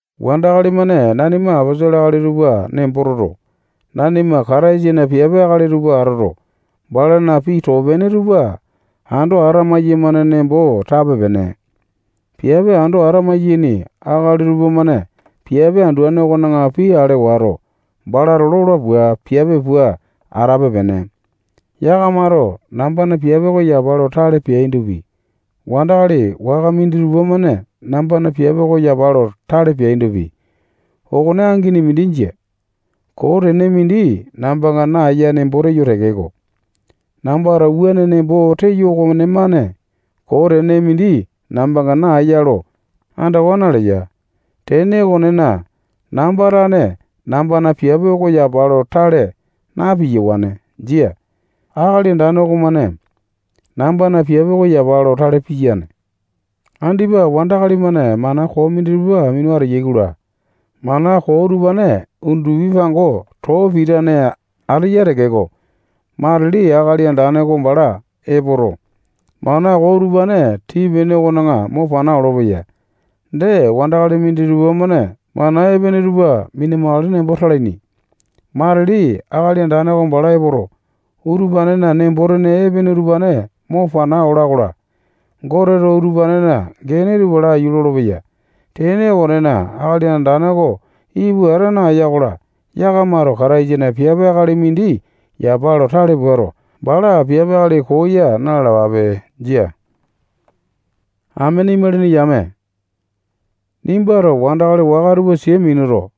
Wandakali-mane nanima aposolo akali tupa nembo toto, nanima Kataisana piape akali tupa atoto, balana pii too-pene tupa ando ata maiyamane nembo tape-pene. Piape ando ata-maiyaini akali tupamane piape anduane okona pii ale wato, balato lola pua, piape pua atape-pene. Yakamato nambana piape oko yapa lo tale peaindopi, wandakali waka minditupa-mane nambana piape oko yapa lo tale peaindopi, okone angini mindi jia. Koo tene mindi nambanga naeya nembo teyo tekeko, nambato wuane nembo teyo okomane koo tene mindi nambanga naeya lo andawa naleya. Tene okonena, namba tane nambana piape oko yapa lo tale na-piyawane. Jia. Akali Andane okomane nambana piape oko yapa lo tale piyane. Andipa wandakali-mane mana koo minditupa minu ateyai-kola, mana koo utupane undupi pango too pitane ateya tekeko, matili Akali Andane oko bala epoto, mana koo utupane tii-pene okona mo pana olopeya. Dee, wandakali minditupa-mane mana epene tupa mina-makale nembo talaini. Matili Akali Andane oko bala epoto, utupanena nembo-tene epene utupane mo pana ola-kola, Goteto utupanena gene tupa laiyu lolopeya. Tene okonena, Akali Andane oko ipu ata naeya-kola, yakamato Kataisana piape akali mindi yapa lo tale puato, bala piape akali koo ya na-lalapape. Jia. Amene imalini yame, nimbato wandakali waka tupa sia minuto,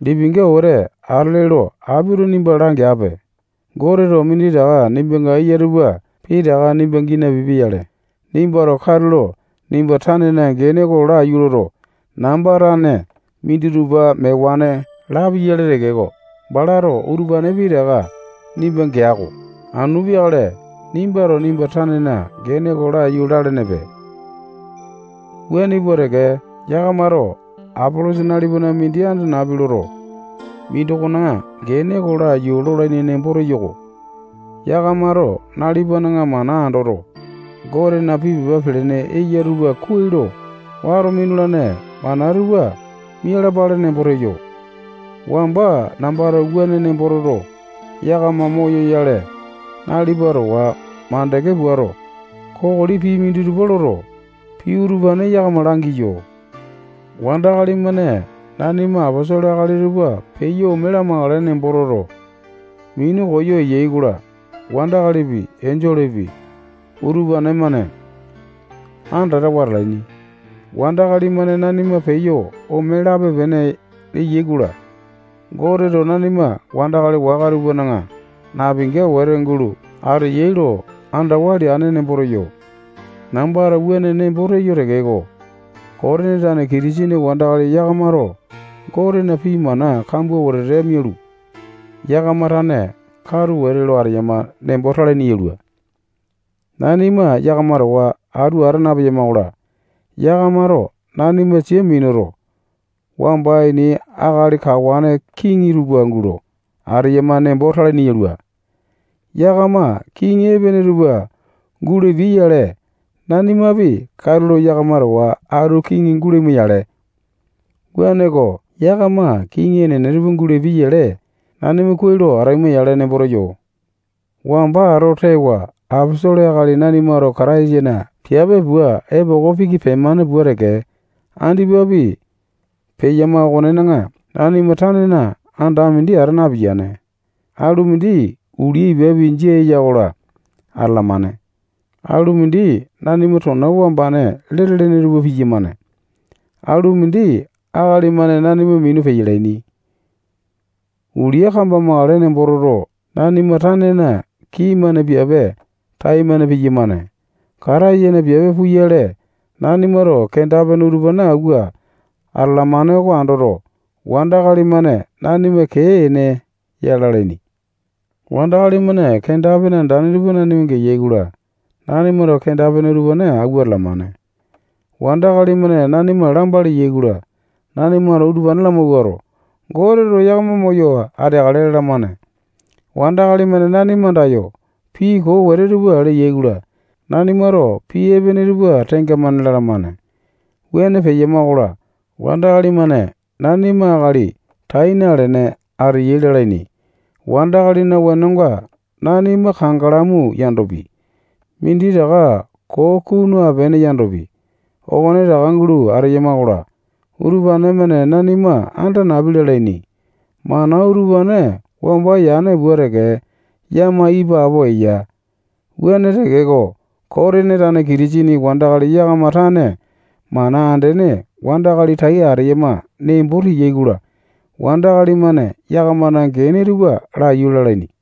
lipinga wete atele lo apito nimba langeape. Goteto minditaka nimbanga eya tupa pitaka nimba gii napipia-yale, nimbato katulo nimba tanena gene oko laiyu loto, namba tane minditupa mewane lapi-yale tekeko, balato utupane pitaka nimba gea-ko. Anu peakale nimbato nimba tanena gene oko laiyu lalenepe. Wuane pua teke, yakamato Apolosa nalipana mindi anda napi loto, mindokona gene oko laiyu lolaini nembo teyo-ko. Yakamato nalipana mana andoto, Gotena pii pepa pelene eya tupa kuai lo wato minulane mana tupa mialapale nembo teyo. Wamba nambato wuane nembo toto, yakama moyoyale, nalipa towa makande puato, kokoli pii minditupa loto, pii utupane yakama langiyo. Wandakali-mane nanima aposolo akali tupa peyo ome lamakale nembo toto, minu koyo eyai-kola, wandakalipi, enjolepi, utupane-mane andatawa atalaini. Wandakali-mane nanima peyo ome lape-pene leai-kola, Goteto nanima wandakali waka tupana napinga wete gulo ateyai lo andawa leane nembo teyo. Nambato wuane nembo teyo tekeko, Kotini tane Kitisene wandakali yakamato Gotena pii mana kambua wetete mialu, yakama tane katu wete eyama nembo talaini yalua. Nanima yakama towa atu ata napema-kola, yakamato nanima sia minuto, wamba ini akali kawane kiŋi tupa gulo ateyama nembo talaini yalua. Yakama kiŋi enene tupa gulapiai-yale, nanimapi katulo yakama towa atu kiŋi gulaima-yale. Wuaneko, yakama kiŋi enene tupa gulapiai-yale, nanima kuai lo ataima-yale nembo teyo. Wamba ato tewa aposolo akali nanimato Kataisana piape pua epoko piki pemane pua teke, andipapi peyama okonena, nanima tanena anda mindi ata napiyane. Alu mindi ulia ipapi jia eya-kola, atalamane. Alu mindi nanima tona wambane lete-lene tupa piyamane. Alu mindi akali-mane nanima minu peyalaini. Ulia kambamakale nembo toto, nanima tanena kii-mane piape taimane piyamane. Kataisana piape puyale, nanimato kenda-pene utupane awua atalamane oko andoto, wandakali-mane nanima kee-ene ya lalaini. Wandakali-mane kenda-pene andane tupa nanima geyai-kola, nanimato kenda-pene utupane awua atalamane. Wandakali-mane nanima lamba leyai-kola, nanimato utupane lamawuato, Goteto yakama moyo ateakale lalamane. Wandakali-mane nanima andayo pii koo wete tupa leyai-kola, nanimato pii epene tupa tenga-mane lalamane. Wuane peyama-kola, wandakali-mane nanima akali tai nalene ateyai lalaini. Wandakalina wenonga nanima kangalamu yandopi, minditaka koo kunu apene yandopi, okonetaka gulo ateyama-kola, utupane-mane nanima anda napi lalaini. Mana utupane wamba yane pua teke yama ipapo eya. Wuane tekeko, Kotini tane Kitisene wandakali yakama tane mana andene wandakali tai ateyama nembo teyai-kola, wandakali-mane yakamana gene tupa laiyu lalaini.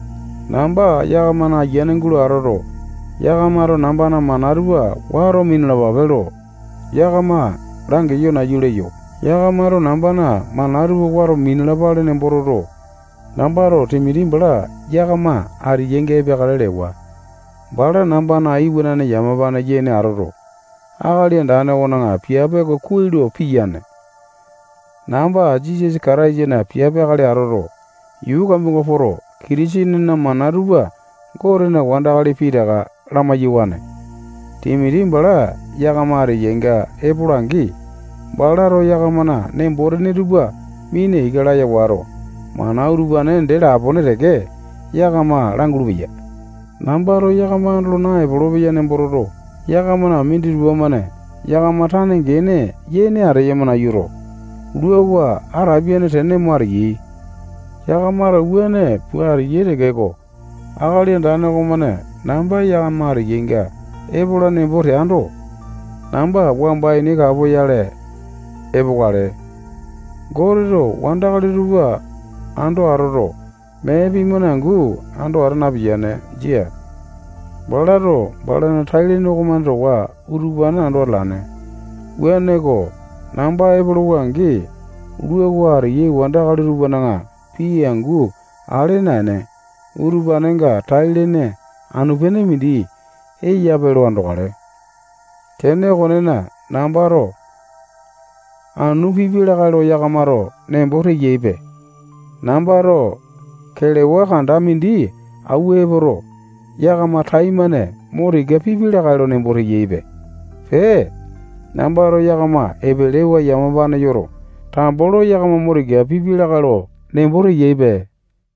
Namba yakamana ayiane gulo atoto, yakamato nambana mana tupa wato minalapape lo yakama langeyo nayu leyo. Yakamato nambana mana utupane wato minalapale nembo toto, nambato Timoti bala yakama ateyainga epeakale lewa. Bala nambana iwanane yamapane yene atoto, Akali Andane okona piape oko kuai lo piyane. Namba Jisasa Kataisana piape akali atoto, yuu kambuanga poto, Kitisenena mana tupa Gotena wandakali pitaka lamai-yawane. Timoti bala yakama ateyainga epola-angi, balato yakamana nembo-tene tupa mina ika laya wato, mana utupane dee lapone teke yakama langulu-peya. Nambato yakama andolo naepolo-peya nembo toto, yakamana minditupa-mane yakama tane gene yene ateyama nayuto, luawa ata apiane tene mo ateyai. Yakamato wuane pua ateyai tekeko, Akali Andane okomane namba yakama ateyainga epola nembo teando, namba wamba ini kapoyale epokale. Goteto wandakali tupa ando atoto, mee pii-mane angu ando ata napiyane. Jia. Balato balana tai-lene okomane towa utupane ando atalane. Wuaneko, namba epolowa-angi, luawa ateyai wandakali tupana pii angu ale naene, utupanenga tai-lene anu-pene mindi eyape lo andokale. Tene okonena, nambato anu pipi lakae lo yakamato nembo teyaipe. Nambato kelewa kanda mindi awua epoto, yakama taimane mo tika pipi lakae lo nembo teyaipe. Pee, nambato yakama epelewa yamapane yoto, tambo lo yakama mo tika pipi lakae lo nembo teyaipe.